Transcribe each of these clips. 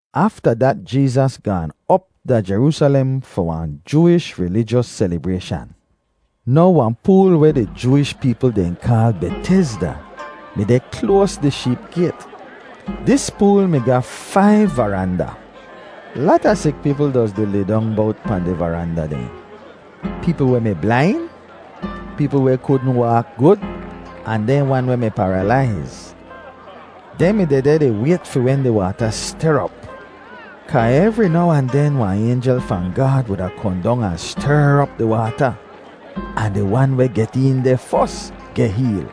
Afta dat Jeezas gaan op da Jeroosalem fi wahn Jooish rilijos selibrayshan. Now wahn pool weh di Jooish peepl dehn kaal Betezda mi deh kloas di Sheep Gayt. Dis pool mi ga faiv varanda. Lata sik peepl doz di lidong bowt pahn di varanda dehn—peepl weh mi blain, peepl weh kudn waak gud, ahn dehn wan weh mi paralaiz. [Dehn mi dehdeh di wayt fi wen di waata ster op. Kaa evri now ahn den wahn aynjel fahn Gaad wuda kohn dong ahn ster op di waata, ahn di wan weh get een deh fos geh heel.]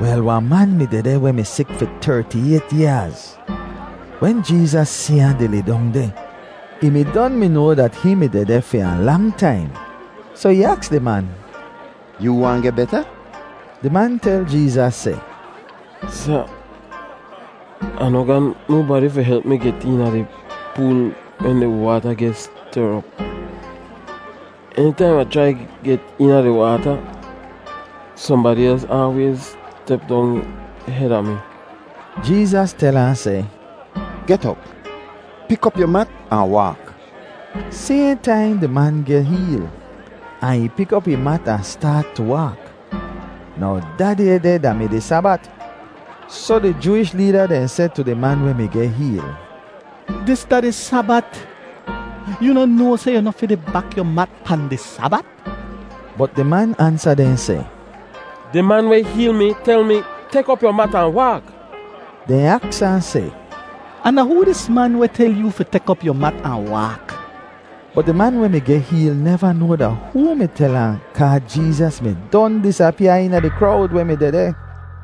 Wel, wahn man mi dehdeh weh mi sik fi terti-ayt yaaz. Wen Jeezas si ahn di lidong deh, ih mi don mi noa dat hihn mi dehdeh fi wahn lang taim, soh ih aks di man, “Yoo waahn geh beta?” Di man tel Jeezas seh, “Sa, Ah noh ga nobadi fi help mi get eena di pool wen di waata geh ster op. Enitaim Ai chrai get eena di waata, sohnbadi els aalwayz step dong heda mi.” Jeezas tel ahn seh, “Get op! Pik op yu mat ahn waak!” Sayhn taim di man geh heel, ahn ih pik op ih mat ahn staat tu waak. Now da day deh da-mi di Sabat, soh di Jooish leeda dehn seh tu di man weh mi geh heel, “Dis da di Sabat. Yoo noh noa seh yu noh fi di bak yu mat pahn di Sabat?” Bot di man ansa dehn seh, “Di man weh heel mi tel mi, ‘Tek op yu mat ahn waak.’” Dehn aks ahn seh, “Ahn da hoo dis man weh tel yoo fi tek op yu mat ahn waak?” Bot di man weh mi geh heel neva noa da hoo mi tel ahn kaa Jeezas mi don disapyaa eena di krowd weh mi dehdeh.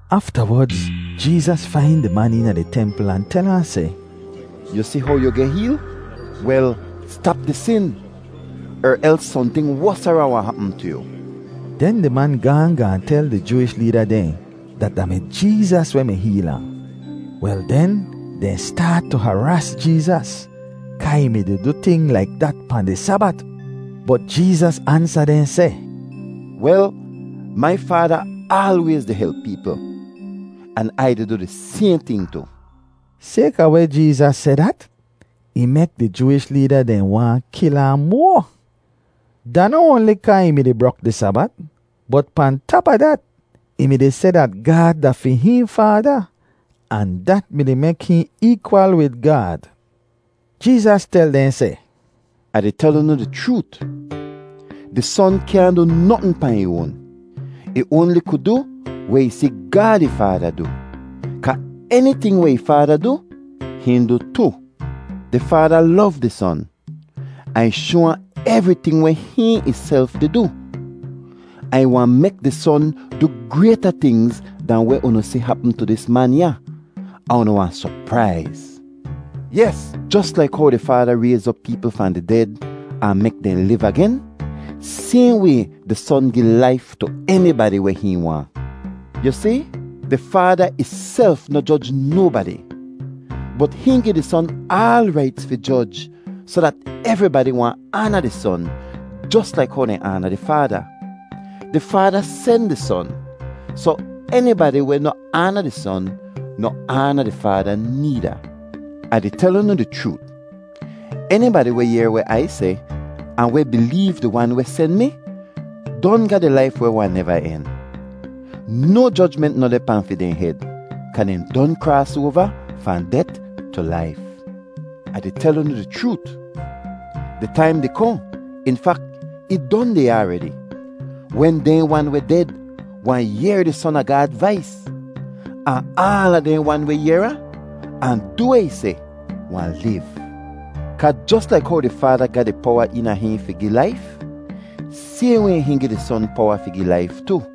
Aftawodz Jeezas fain di man eena di templ ahn tel ahn seh, “Yu si how yu geh heel? Wel, stap di sin er els sohnting wosara wahn hapm tu yu.” Den di man gaahn gaahn tel di Jooish leeda dehn dat da mi Jeezas weh mi heel ahn. Wel den, dehn staat tu haraas Jeezas kaa ih mi-di du ting laik dat pahn di Sabat. Bot Jeezas ansa dehn seh, “Wel, mai Faada aalwayz di help peepl, an Ai di du di sayhn ting tu.” Sayka weh Jeezas seh dat, ih mek di Jooish leeda dehn waahn kil ahn moa. Da noh oanli kaa ih mi-di brok di Sabat, bot pahn tap a dat, ih mi-di seh dat Gaad da fi hihn Faada, ahn dat mi-di mek hihn eekwal wid Gaad. Jeezas tel dehn seh, “Ah di tel unu di chroot, di Son kyaahn du notn pahn ih oan. Ih oanli ku du weh ih si Gaad ih Faada du, kaa eniting weh ih Faada du, hihn du tu. Di Faada lov di Son, ahn ih shoa ahn evriting weh hihn ihself di du; ahn ih wahn mek di Son du grayta tingz dahn weh unu si hapm tu dis man ya, ahn unu wahn sopraiz. Yes, jos laik how di Faada rayz op peepl fahn di ded ahn mek dehn liv agen, sayhn way di Son gi laif tu enibadi weh hihn waahn. Yu si, di Faada ihself noh joj nobadi, bot hihn gi di Son aal raits fi joj soh dat evribadi wahn aana di Son jos laik how dehn aana di Faada. Di Faada sen di Son, soh enibadi weh noh aana di Son noh aana di Faada needa. “Ah di tel unu di chroot, enibadi weh yehr weh Ai seh ahn weh bileev di Wan weh sen mi, don ga di laif weh wahn neva en. No jojment noh deh pahn fi dehn hed, kaa dehn don kraas oava fahn det tu laif. “Ah di tel unu di chroot, di taim di kohn; in fak, ih don deh ya aredi, wen dehn wan weh ded wahn yehr di Son a Gaad vais; ahn aala dehn wan weh yehr ahn, ahn du weh ih seh, wahn liv. Kaa jos laik how di Faada ga di powa eena hihn fi gi laif, sayhn way hihn gi di Son powa fi gi laif tu;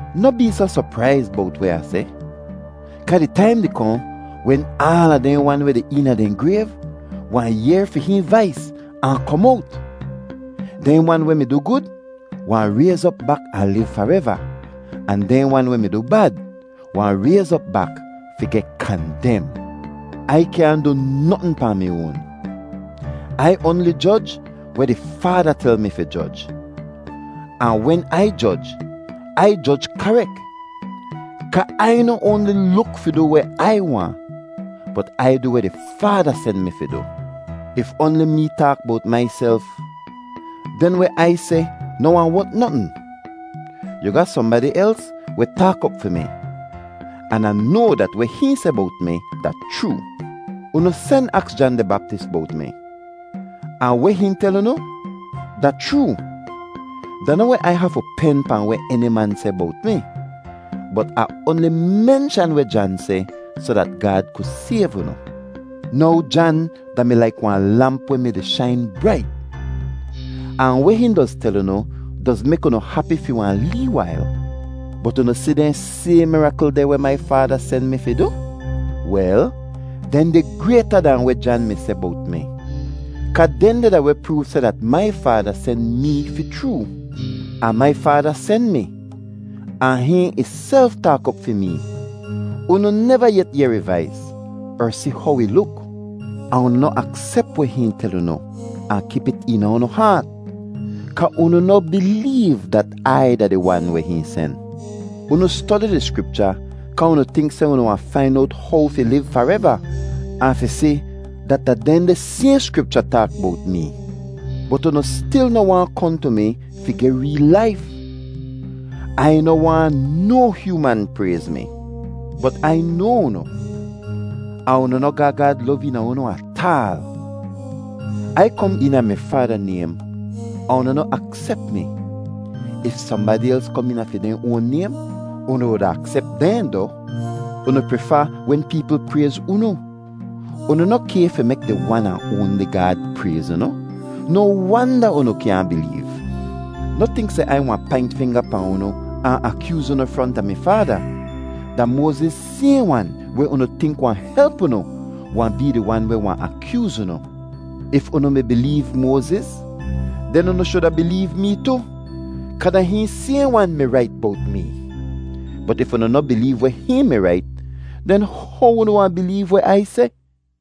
“Noh bee soh sopraiz bowt weh Ah seh, kaa di taim di kohn wen aala dehn wan weh deh eena dehn grayv wahn yehr fi hihn vais ahn kom owt. Dehn wan weh mi du gud wahn rayz op bak ahn liv fareva; ahn dehn wan weh mi du bad wahn rayz op bak fi geh kandem. “Ai kyaahn du notn pahn mi oan. Ai oanli joj weh di Faada tel mi fi joj. Ahn wen Ai joj, Ai joj karek, kaa Ai noh oanli luk fi du weh Ai waahn, bot Ai du weh di Faada sen mi fi du. “If oanli mee taak bowt maiself, den weh Ai seh noh wahn wot notn. Yu ga sohnbadi els weh taak op fi mi, an Ah noa dat weh hihn seh bowt mi da chroo. “Unu sen aks Jan di Baptis bowt mi, ahn weh hihn tel unu da chroo. Da noh weh Ai hafu pen pahn weh eni man seh bowt mi, bot Ah oanli menshan weh Jan seh soh dat Gaad ku sayv unu. Now Jan da-mi laik wahn lamp weh mi-di shain brait, ahn weh hihn doz tel unu doz mek unu hapi fi wahn lee wail. “Bot unu si dehn sayhn mirakl deh weh mai Faada sen mi fi du? Wel, dehndeh grayta dahn weh Jan mi seh bowt mi, kaa dehndeh da weh proov seh dat mai Faada sen mee fi chroo. “Ahn mai Faada sen mi, ahn hihn ihself taak op fi mee. Unu neva yet yehr ih vais er si how ih luk, ahn unu noh aksep weh hihn tel unu ahn kip it eena unu haat, kaa unu noh bileev dat Ai da di Wan weh hihn sen. “Unu stodi di Skripcha kaa unu tink seh unu wahn fain owt how fi liv fareva; ahn fi si dat da dehndeh sayhn Skripcha taak bowt mee. Bot unu stil noh waahn kohn tu mi fi geh reel laif. “Ai noh waahn no hyooman prayz mi. Bot Ai noa unu, ahn unu noh ga Gaad lov eena unu ataal. Ai kom eena mi Faada naym, ahn unu noh aksep mi; if sohnbadi els kom eena fi dehn oan naym, unu wuda aksep dehn doh. Unu prifa wen peepl prayz unu. Unu noh kay fi mek di Wan ahn oanli Gaad prayz unu. No wanda unu kyaahn bileev! “Noh tink seh Ai wahn paint finga pahn unu ahn akyooz unu fronta mi Faada; da Moaziz sayhn wan weh unu tink wahn help unu wahn bee di wan weh wahn akyooz unu. If unu mi bileev Moaziz, den unu shuda bileev mee tu, kaa da hihn sayhn wan mi rait bowt mee. Bot if unu noh bileev weh hihn mi rait, den how unu wahn bileev weh Ai seh?”